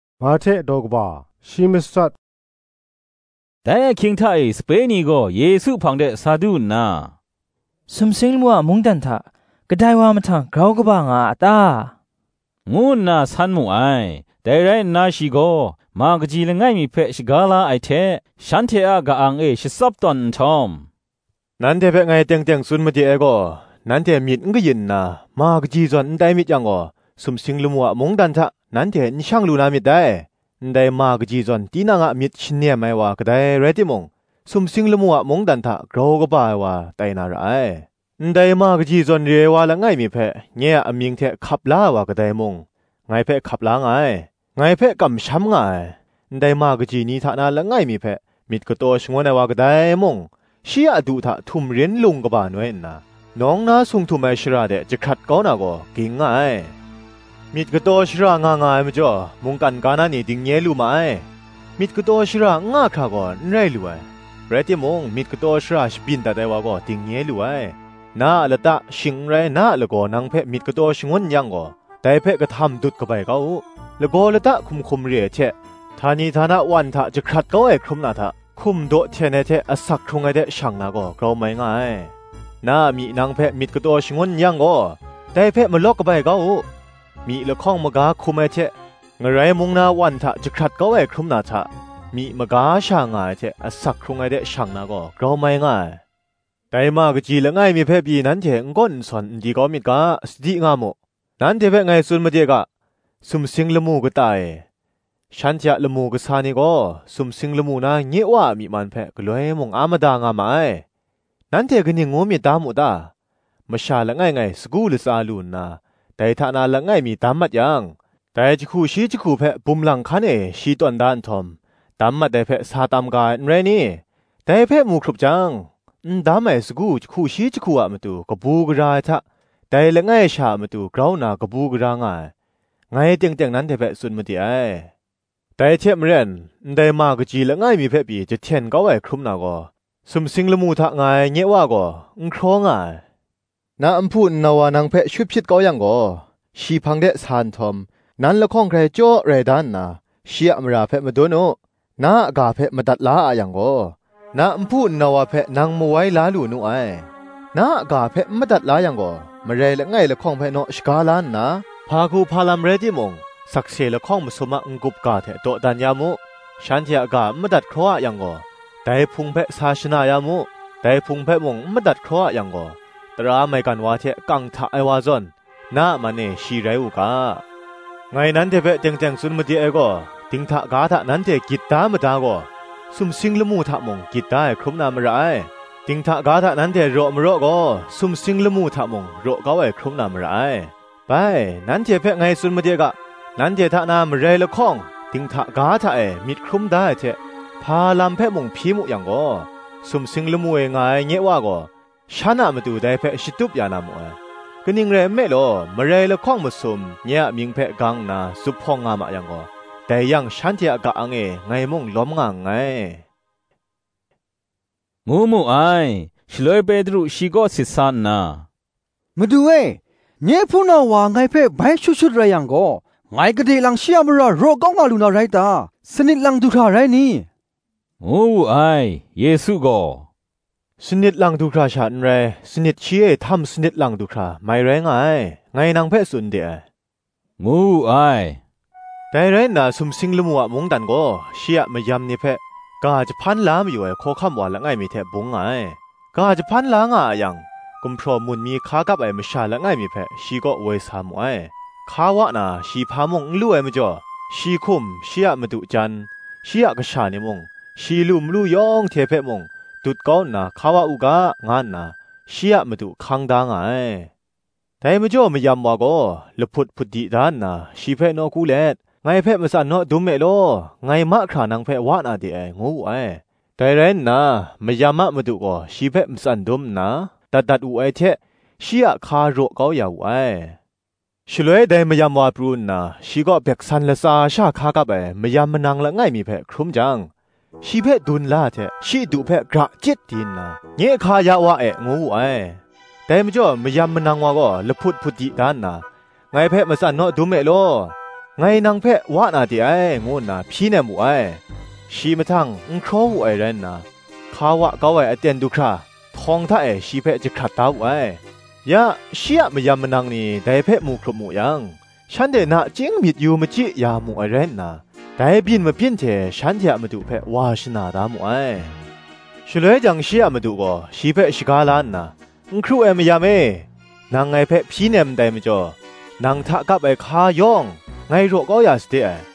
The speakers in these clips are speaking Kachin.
Grau Kaba Ai Kadai Rai Ta? Dai ahkying hta e sape ni gaw Yesu hpang de sa du nna, “Sumsing lamu a mungdan hta kadai wa mahtang grau kaba nga a ta?” ngu nna san mu ai. Dai rai nna shi gaw ma kaji langai mi hpe shaga la ai hte, shanhte a ka-ang e shatsap tawn nhtawm, “Nanhte hpe ngai teng teng tsun made ai gaw, nanhte myit n kayin nna, ma kaji zawn n tai myit yang gaw, sumsing lamu a mungdan hta, nanhte n shang lu na myit dai. Ndai ma kaji zawn, tinang a myit shanem ai wa kadai rai timung, sumsing lamu a mungdan hta, grau kaba ai wa tai na ra ai. Ndai ma kaji zawn re ai wa langai mi hpe, nye a amying hte hkap la ai wa kadai mung, ngai hpe hkap la nga ai. Ngai hpe kamsham nga ai, ndai ma kaji ni hta na langai mi hpe, myit kataw shangun ai wa kadai mung, shi a du hta htumrin lung kaba noi nna, nawng na sung htum ai shara de jahkrat kau na gaw, ging nga ai. Myit kataw shara nga nga ai majaw, mungkan ga na ni dingnye lu ma ai: myit kataw shara n nga hkra gaw, n rai lu ai; rai timung, myit kataw shara shabyin dat ai wa gaw, dingnye lu ai. Na a lata, shing n rai, na a lagaw nang hpe myit kataw shangun n yang gaw, dai hpe kahtam dut kabai kau u: lagaw lata hkum hkum re ai hte, htani htana wan hta jahkrat kau ai hkrum na hta, hkum daw hten ai hte asak hkrung ai de shang na gaw, grau mai nga ai. Na a myi nang hpe myit kataw shagun n yang gaw, dai hpe malawk kabai kau u: myi lahkawng maga hkum ai hte, ngarai mung na wan hta jahkrat kau ai hkrum na hta, myi maga sha nga ai hte asak hkrung ai de shang na gaw, grau mai nga ai. Dai ma kaji langai mi hpe pyi nanhte n gawn n sawn n di kau myit ga, sadi nga mu: nanhte hpe ngai tsun made ga, Sumsing lamu kata e, shanhte a lamu kasa ni gaw, sumsing lamu na nye Wa a myi man hpe, galoi mung a mada nga ma ai. Nanhte kaning ngu myit da mu ta? masha langai ngai sagu latsa lu nna, dai hta na langai mi dam mat yang, dai jahku shi jahku hpe bum lang hkan e shi tawn da nhtawm, dam mat ai hpe sa tam ga ai, n rai ni? Dai hpe mu hkrup jang, n dam ai sagu jahku shi jahku a matu kabu gara ai hta, dai langai sha a matu grau nna kabu gara nga ai, ngai teng teng nanhte hpe tsun made ai. Dai hte maren, ndai ma kaji langai mi hpe pyi jahten kau ai hkrum na gaw, sumsing lamu hta nga ai nye Wa gaw, n hkraw nga ai. Na nhpu nnau wa nang hpe shut hpyit kau yang gaw, shi hpang de sa nhtawm, nan lahkawng hkrai chyaw rai da nna, shi a mara hpe madun u: na a ga hpe madat la a yang gaw, na nhpu nnau wa hpe nang mawai la lu nu ai. Na a ga hpe n madat la yang gaw, marai langai lahkawng hpe naw shaga la nna, hpa hku hpa lam rai timung, sakse lahkawng masum a n-gup ga hte dawdan ya mu. Shanhte a ga n madat hkraw a yang gaw, dai Hpung hpe sa shana ya mu: dai Hpung hpe mung n madat hkraw a yang gaw, tara maigan wa hte kang hta ai wa zawn, na a man e shi rai u ga. Ngai nanhte hpe teng teng tsun made ai gaw, Dinghta ga hta nanhte gyit da mada gaw, sumsing lamu hta mung, gyit da ai hkrum na mara ai: dinghta ga hta nanhte raw maraw gaw, sumsing lamu hta mung, raw kau ai hkrum na mara ai. Bai, nanhte hpe ngai tsun made ga, Nanhte hta na marai lahkawng, dinghta ga hta e myit hkrum da ai hte hpa lam hpe mung hpyi mu yang gaw, sumsing lamu e nga ai nye Wa gaw, shan a matu dai hpe shatup ya na mu ai. Kaning rai nme law, marai lahkawng masum, nye a mying hpe gang nna zuphpawng nga ma yang gaw, dai yang shanhte a ka-ang e ngai mung lawm nga nngai,” ngu mu ai. Shaloi Petru shi kaw sit sa nna, “Madu e, nye hpunau wa ngai hpe bai shut shut rai yang gaw, ngai gade lang shi a mara raw kau nga lu na rai ta? sanit lang du hkra rai ni?” ngu wu ai. Yesu gaw, “Sanit lang du hkra sha n rai; sanit shi e htam sanit lang du hkra, mai rai nga ai, ngai nang hpe tsun de ai,” ngu wu ai. “Dai rai nna sumsing lamu a mungdan gaw, shi a mayan ni hpe, ga jahpan la mayu ai hkawhkam wa langai mi hte bung nga ai. Ga jahpan la nga a yang, gumhpraw mun mi hka kap ai masha langai mi hpe, shi kaw woi sa mu ai. Hka wa na, shi hpa mung n lu ai majaw, shi hkum, shi a madu jan, shi a kasha ni mung, shi lu malu yawng hte hpe mung, dut kau nna hka wa u ga, nga nna shi a madu hkang da nga ai. Dai majaw mayam wa gaw, lahput hput di da nna shi hpe nawku let, Ngai hpe matsan naw dum e law, ngai mahkra nang hpe wa na de ai, ngu wu ai. Dai rai nna, mayam a madu gaw shi hpe matsan dum nna, dat dat wu ai hte, shi a hka raw kau ya wu ai. Shaloi dai mayam wa pru nna shi kaw gumhpraw latsa sha hka kap ai mayam manang langai mi hpe hkrum jang, shi hpe dun la ai hte shi du hpe gra chyit di nna, Nye hka ya wa e, ngu wu ai. Dai majaw mayam manang wa gaw lahput hput di da nna, Ngai hpe matsan naw dum e law, ngai nang hpe wa na de ai, ngu nna hpyi nem wu ai. Shi mahtang n hkraw wu ai rai nna, hka wa kau ai aten du hkra, htawng hta e shi hpe jahkrat da wu ai. Ya, shi a mayam manang ni dai hpe mu hkrup mu yang, shanhte nachying myit yu machyi ya mu ai rai nna, dai byin mabyin hte shanhte a madu hpe wa shana da mu ai. Shaloi jang shi a madu gaw shi hpe shaga la nna, N hkru ai mayam e, nang ngai hpe hpyi nem ndai majaw, nang hta kap ai hka yawng, ngai raw kau ya sade ai: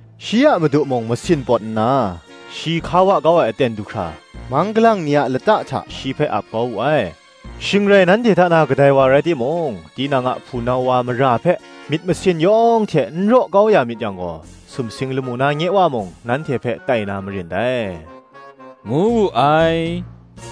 Shi a madu mung masin pawt nna, shi hka wa kau ai aten du hkra, mang galang ni a lata hta shi hpe ap kau wu ai. Shing rai nanhte hta na kadai wa rai timung, tinang a hpunau wa mara hpe myit masin yawng hte n raw kau ya myit yang gaw, sumsing lamu na nye Wa mung, nanhte hpe tai na marin dai,” ngu wu ai.